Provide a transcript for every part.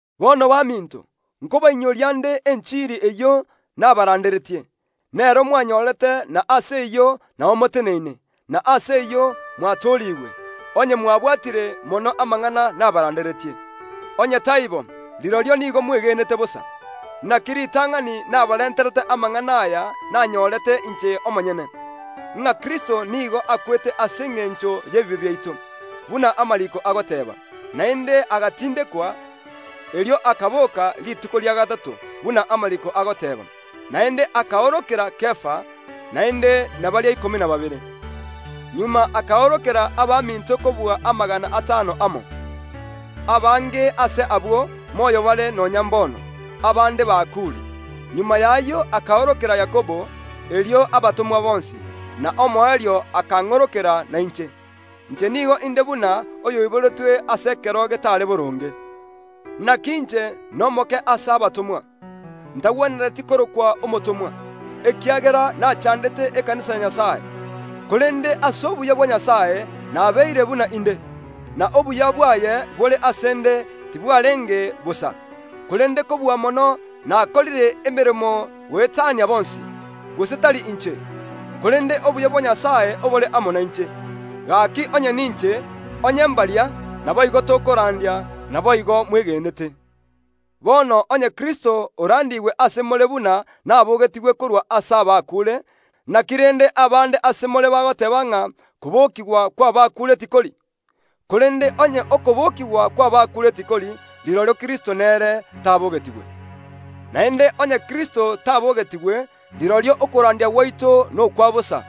Bono baminto, nkobainyoria nde enchiri eyio nabaranderetie; nero mwanyorete, na ase eyio nao moteneine, na ase eyio mwatoorigwe, onye mwabwatire mono amang’ana nabaranderetie. Onye taibo, rirorio nigo mwegenete bosa. Naki ritang’ani nabarenterete amang’ana aya nanyorete inche omonyene, ng’a Kristo nigo akwete ase engencho y’ebibe biaito, buna amariiko agoteeba; naende agatindekwa, erio akaboka rituko ria gatato, buna amariiko agoteeba; naende akaorokera Kefa; naende na baria ikomi na babere. Magega akaorokera abaminto goetania amagana atano amo. Abange ase abwo moyo bare nonya mbono, abande bakuure. Magega y’ayio akaorokera Yakobo, erio abatomwa bonsi. Na omoerio akang’orokera nainche. Inche nigo inde buna oyoiboretwe ase ekero getare boronge. Naki inche nomoke ase abatomwa, ntagwenereti korokwa omotomwa, ekiagera nachandete ekanisa ya Nyasae. Korende ase obuya bwa Nyasae nabeire buna inde; na obuya bwaye bore ase ’nde tibwarenge bosa. Korende kobua mono nakorire emeremo goetania bonsi, gose tari inche, korende obuya bwa Nyasae obore amo nainche. Gaki onye ninche, gose mbaria, naboigo tokorandia, naboigo mwegenete. Bono onye Kristo orandiigwe ase more buna nabogetigwe korwa ase abakuure, naki rende abande ase more bagoteeba ng’a kobokigwa kw’abakuure tikori? Korende onye okobokigwa kw’abakuure tikori, rirorio Kristo nere tabogetigwe. Naende onye Kristo tabogetigwe, rirorio okorandia gwaito nokwa bosa,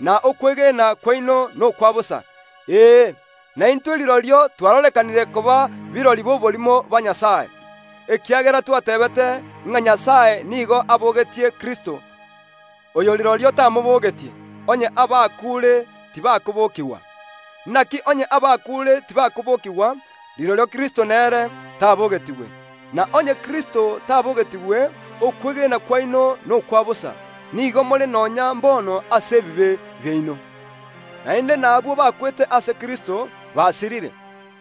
na okwegena kwaino nokwa bosa. Ee, naintwe rirorio twarorekanire koba birori b’oborimo ba Nyasae, ekiagera twateebete ng’a Nyasae nigo abogetie Kristo, oyo rirorio tamobogetie, onye abakuure tibakobokigwa. Naki onye abakuure tibakobokigwa, rirorio Kristo nere tabogetigwe. Na onye Kristo tabogetigwe, okwegena kwaino nokwa bosa; nigo more nonya mbono ase ebibe biaino. Naende nabwo bakwete ase Kristo basirire.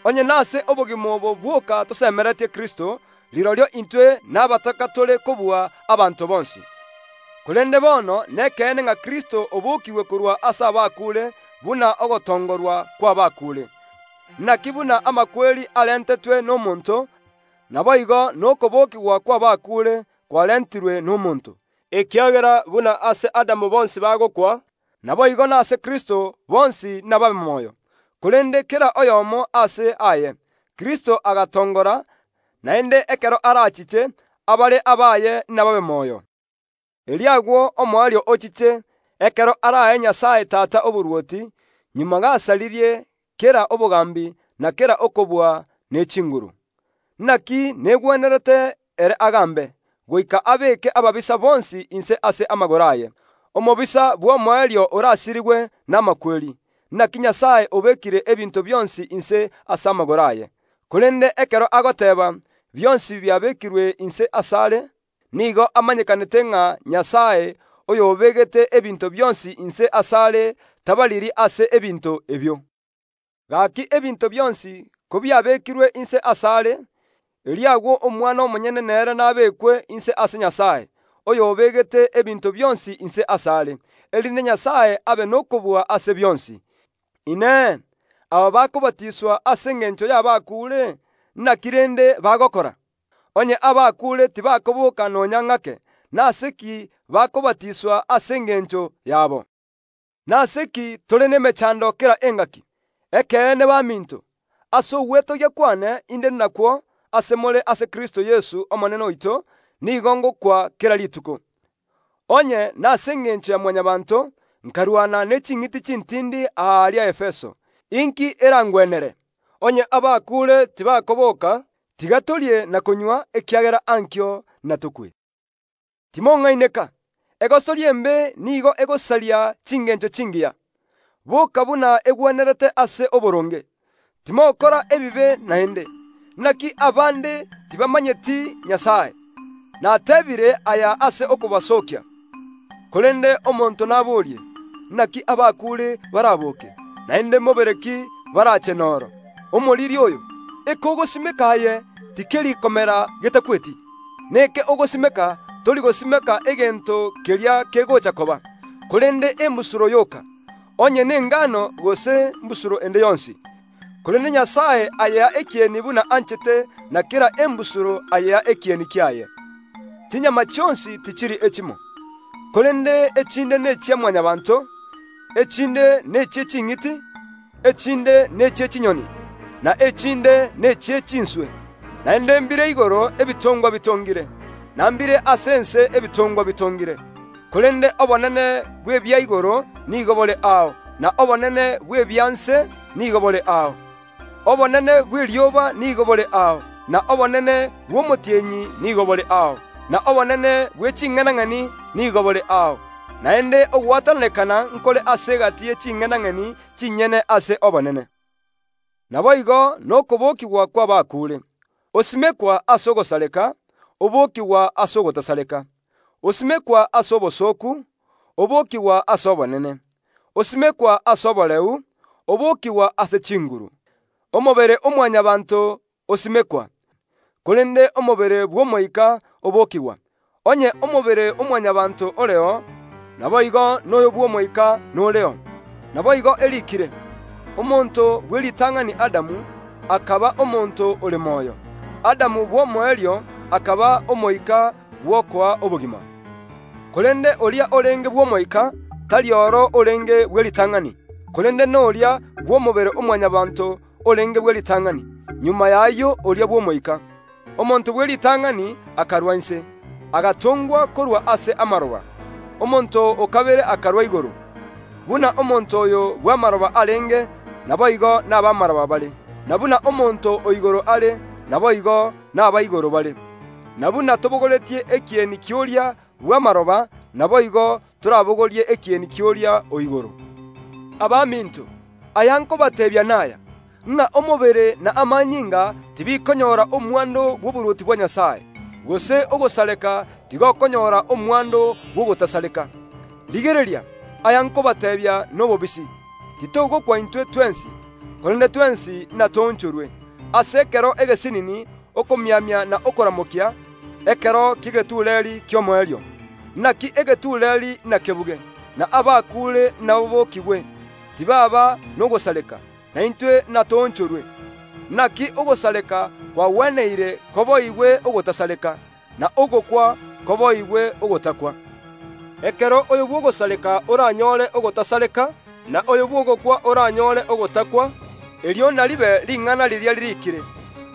Onye nase obogima obo bwoka tosemeretie Kristo, rirorio intwe nabataka tore kobua abanto bonsi. Korende bono nekeene ng’a Kristo obokiigwe korwa ase abakuure buna ogotongorwa kw’abakuure. Naki buna amakweri arentetwe nomonto, naboigo nokobokigwa kw’abakuure kwarentirwe nomonto. Ekiagera buna ase Adamu bonsi bagokwa, naboigo nase Kristo bonsi nababe moyo, korende kera oyomo aase aye; Kristo agatongora, naende ekero arachiche, abare abaye nababe moyo. Erio agwo omoerio ochiche, ekero arae Nyasae Tata oborwoti, magega gasaririe kera obogambi na kera okobua ne chinguru. Naki negwenerete ere agambe, goika abeeke ababisa bonsi inse ase amagoro aye. Omobisa bw’omoerio orasirigwe namakweri. “Naki Nyasae obekire ebinto bionsi inse ase amagoro aye.” Korende ekero agoteeba, “Bionsi biabekirwe inse asare”, nigo amanyekanete ng’a Nyasae, oyobegete ebinto bionsi inse asare, tabariri ase ebinto ebio. Gaki ebinto bionsi kobiabekirwe inse asare, erio agwo Omwana omonyene nere nabekwe inse ase Nyasae, oyo obegete ebinto bionsi inse asare, erinde Nyasae abe nokobua ase bionsi. Inee! Aba bakobatiswa ase engencho y’abakuure, naki rende bagokora? Onye abakuure tibakoboka nonya ng’ake, nase ki bakobatiswa ase engencho yabo? Nase ki tore nemechando kera engaki? Ekeene baminto, ase ogwetogia kwane inde nakwo ase more ase Kristo Yeso Omonene oito, nigo ngokwa kera rituko. Onye, nase engencho ya Mwanyabaanto, nkarwana ne ching’iti chintindi aaria Efeso, inki erangwenere? Onye abakuure tibakoboka, “Tiga torie na konywa, ekiagera ankio natokwe.” Timong’aineka! Egosori embe nigo egosaria chingencho chingiya. Boka buna egwenerete ase oboronge, timokora ebibe naende. Naki abande tibamomanyeti Nyasae. Natebiire aya ase okobasookia. Korende omonto naborie, “Naki abakuure baraboke? Naende mobere ki barache noro?” Omoriri oyo, eke ogosimeka aye, tikeri komera getakweti. Neke ogosimeka, tori gosimeka egento keria kegocha koba, korende embusuro yoka; onye nengano gose mbusuro ende yonsi. Korende Nyasae ayea ekieni buna anchete, na kera embusuro ayea ekieni kiaye. Chinyama chionsi tichiri echimo; korende echinde nechia Mwanyabaanto, echinde nechie ching’iti, echinde nechie chinyoni, na echinde nechie chinswe. Naende mbire igoro ebitongwa bitongire, na mbire ase ense ebitongwa bitongire, korende obonene bw’ebia igoro nigo bore ao, na obonene bw’ebia nse nigo bore ao. Obonene bw’erioba nigo bore ao, na obonene bw’omotienyi nigo bore ao, na obonene bwe ching’enang’eni nigo bore ao, naende ogwatananekana nkore ase egati ye ching’enang’eni chinyene ase obonene. Naboigo nokobokigwa kw’abakuure. Osimekwa ase ogosareka, obokigwa ase ogotasareka. Osimekwa ase obosooku, obokigwa ase obonene; osimekwa ase oboreu, obokigwa ase chinguru. Omobere o Mwanyabaanto osimekwa, korende omobere bw’omoika obokigwa. Onye omobere o Mwanyabaanto oreo, naboigo noyo bw’omoika noreo. Naboigo eriikire, “Omonto bw’eritang’ani Adamu akaba omonto ore moyo”, Adamu bw’omoerio akaba omoika bw’okoa obogima. Korende oria orenge bw’omoika, tari oro orenge bw’eritang’ani, korende noria bw’omobere o Mwanyabaanto orenge bw’eritang’ani; magega y’ayio oria bw’omoika. Omonto bw’eritang’ani akarwa inse, agatongwa korwa ase amaroba; omonto o kabere akarwa igoro. Buna omonto oyo bw’amaroba arenge, naboigo nab’amaroba bare; na buna omonto o igoro are, naboigo naba igoro bare. Na buna tobogoretie ekieni ki’oria bw’amaroba, naboigo torabogorie ekieni ki’oria o igoro. Abaminto, aya nkobateebia naya, ng’a omobere na amanyinga tibikonyora omwando bw’oborwoti bwa Nyasae; gose ogosareka tigokonyora omwando bw’ogotasareka. Rigereria, aya nkobateebia nobobisi. Titogokwa intwe twensi, korende twensi natoonchorwe, ase ekero egesinini, okomiamia na okoramokia, ekero ki’egetureeri ki’omoerio. Naki egetureeri nakebuge, na abakuure nababokigwe, tibaaba nogosareka, na intwe natoonchorwe. Naki ogosareka kwagweneire koboigwe ogotasareka, na ogokwa koboigwe ogotakwa. Ekero oyo bw’ogosareka oranyore ogotasareka, na oyo bw’ogokwa oranyore ogotakwa; erio naribe ring’ana riria ririikire,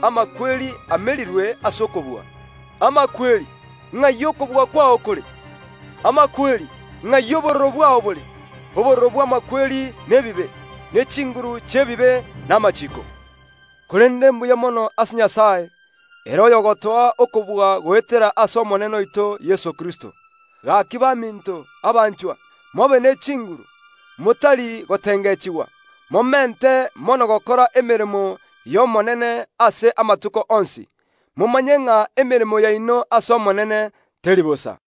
“Amakweri amerirwe ase okobua.” “Amakweri, ng’ai okobua kwao kore? Amakweri, ng’ai obororo bwao bore?” Obororo bw’amakweri nebibe, ne chinguru chi’ebibe namachiiko. Korende mbuya mono ase Nyasae, ere oyogotoa okobua goetera ase Omonene oito Yeso Kristo. Gaki baminto, abanchwa, mobe ne chinguru, motari gotengechigwa, momente mono gokora emeremo y’Omonene ase amatuko onsi, momanye ng’a emeremo yaino ase Omonene teri bosa.